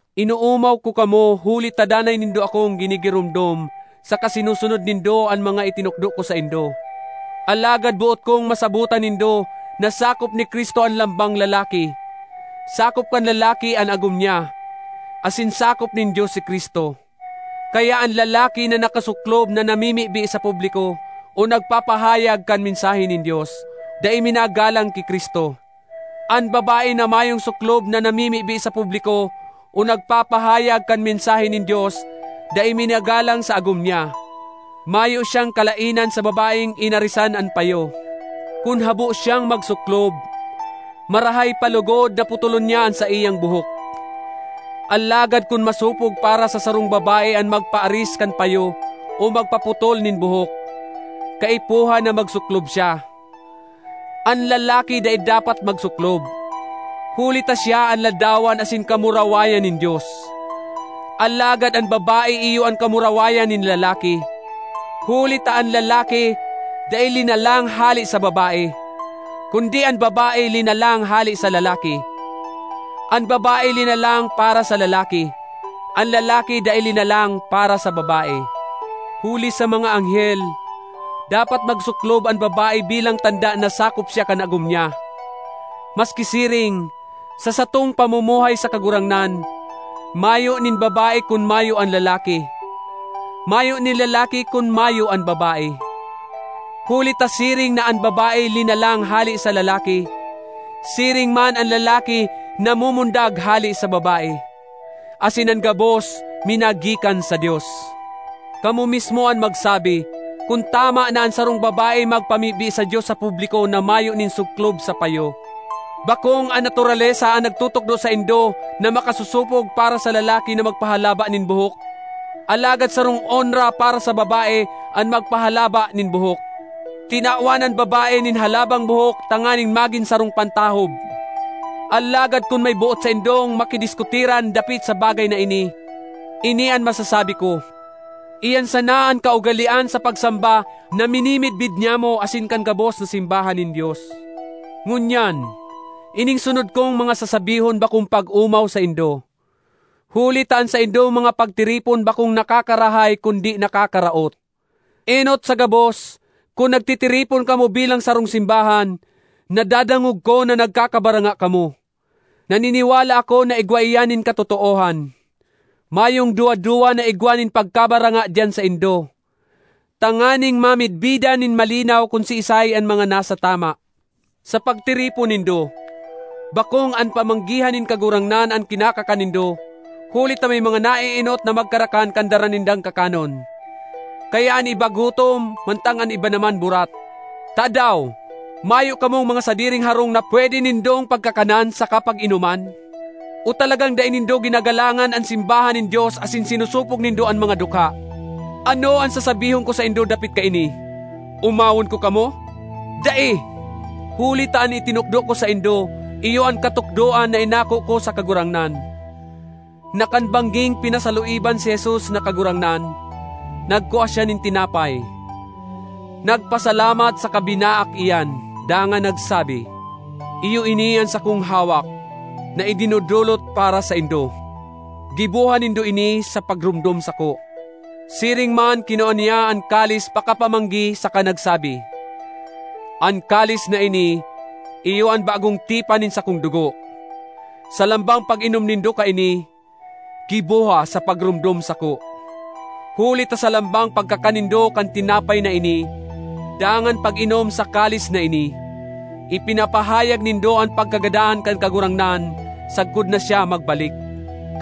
Inoomaw ko kamo huli ta danay nindo akong ginigiromdom saka sinusunod nindo an mga itinukdo ko saindo. Alagad boot kong masabotan nindo na sakop ni Cristo an lambang lalaki; sakop kan lalaki an agom niya, asin sakop nin Dios si Cristo. Kaya an lalaki na nakasuklob na namimibi sa publiko o nagpapahayag kan mensahe nin Dios, dai minagalang ki Cristo. An babae na mayong suklob na namimibi sa publiko o nagpapahayag kan mensahe nin Dios, dai minagalang sa agom niya. Mayo siyang kalaenan sa babaeng inarisan an payo. Kun habo siyang magsuklob, marahay pa logod na putolon niya an saiyang buhok. Alagad kun masopog para sa sarong babae an magpaaris kan payo o magpaputol nin buhok, kaipuhan na magsuklob siya. An lalaki dai dapat magsuklob, huli ta siya an ladawan asin kamurawayan nin Dios; alagad an babae iyo an kamurawayan nin lalaki; huli ta an lalaki dai linalang hale sa babae, kundi an babae linalang hale sa lalaki. An babae linalang para sa lalaki; an lalaki dai linalang para sa babae. Huli sa mga anghel, dapat magsuklob an babae bilang tanda na sakop siya kan agom niya. Maski siring, sa satong pamumuhay sa Kagurangnan, mayo nin babae kun mayo an lalaki; mayo nin lalaki kun mayo an babae. Huli ta siring na an babae linalang hale sa lalaki, siring man an lalaki namumundag hale sa babae; asin an gabos minagikan sa Dios. Kamo mismo an magsabi kun tama na an sarong babae magpamibi sa Dios sa publiko na mayo nin suklob sa payo. Bakong an naturalesa an nagtutukdo saindo na makasosopog para sa lalaki na magpahalaba nin buhok? Alagad sarong onra para sa babae an magpahalaba nin buhok. Tinawan an babae nin halabang buhok tanganing magin sarong pantahob. Alagad kun may boot saindong makidiskutiran dapit sa bagay na ini, ini an masasabi ko: iyan sana an kaugalean sa pagsamba na minimidbid nyamo asin kan gabos na simbahan nin Dios. Ngunyan, ining sunod kong mga sasabihon bakong pag-omaw saindo, huli ta an saindong mga pagtiripon bakong nakakarahay kundi nakakaraot. Enot sa gabos, kun nagtitiripon kamo bilang sarong simbahan, nadadangog ko na nagkakabaranga kamo. Naniniwala ako na igwa iyan nin katotoohan. (Mayong duwa-duwa na igwa nin pagkabaranga diyan saindo, tanganing mamidbidan nin malinaw kun siisay an mga nasa tama.) Sa pagtiripon nindo, bakong an Pamanggihan nin Kagurangnan an kinakakan nindo, huli ta may mga naeenot na magkarakan kan dara nindang kakanon, kaya an iba gutom mantang an iba naman burat. Tadaw! Mayo kamong mga sadiring harong na pwede nindong pagkakanan saka pag-inoman? O talagang dai nindo ginagalangan an simbahan nin Dios asin sinosopog nindo an mga dukha? Ano an sasabihon ko saindo dapit kaini? Omawon ko kamo? Dai! Huli ta an itinukdo ko saindo iyo an katukdoan na inako ko sa Kagurangnan: na kan bangging pinasaluiban si Jesus na Kagurangnan, nagkua siya nin tinapay, nagpasalamat saka binaak iyan, dangan nagsabi, “Iyo ini an sakong hawak na idinodolot para saindo. Giboha nindo ini sa pagromdom sako.” Siring man kinua niya an kalis pakapamanggi saka nagsabi, “An kalis na ini iyo an bagong tipan nin sakong dugo. Sa lambang pag-inom nindo kaini, giboha sa pagromdom sako.” Huli ta sa lambang pagkakan nindo kan tinapay na ini dangan pag-inom sa kalis na ini, ipinapahayag nindo an pagkagadan kan Kagurangnan sagkod na siya magbalik.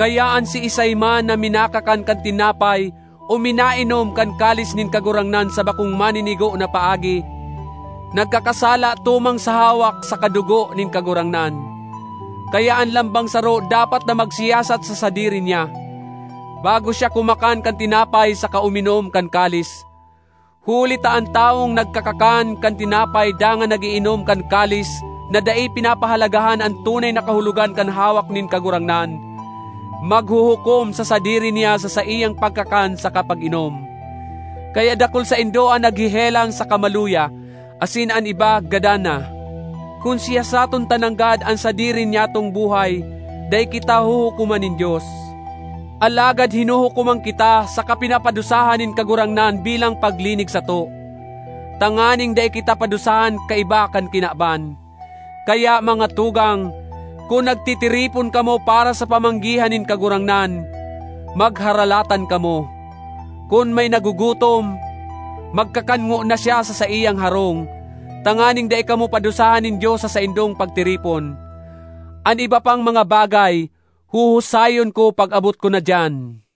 Kaya an siisay man na minakakan kan tinapay o minainom kan kalis nin Kagurangnan sa bakong maninigo na paagi, nagkakasala tumang sa hawak saka dugo nin Kagurangnan. Kaya an lambang saro dapat na magsiyasat sa sadiri niya, bago siya kumakan kan tinapay saka uminom kan kalis. Huli ta an tawong nagkakakan kan tinapay dangan nag-iinom kan kalis na dai pinapahalagahan an tunay na kahulogan kan hawak nin Kagurangnan, maghuhukom sa sadiri niya sa saiyang pagkakan saka pag-inom. Kaya dakul saindo an naghehelang saka maluya, asin an iba gadan na. Kun siyasaton ta nanggad an sadiri nyatong buhay, dai kita huhukoman nin Dios. Alagad hinuhukoman kita saka pinapadusahan nin Kagurangnan bilang paglinig sato, tanganing dai kita padusahan kaiba kan kinaban. Kaya, mga tugang, kun nagtitiripon kamo para sa Pamanggihan nin Kagurangnan, magharalatan kamo. Kun may nagugutom, magkakan ngona siya sa saiyang harong, tanganing dai kamo padusahan nin dios sa saindong pagtiripon. An iba pang mga bagay, huhusayon ko pag-abot ko na diyan.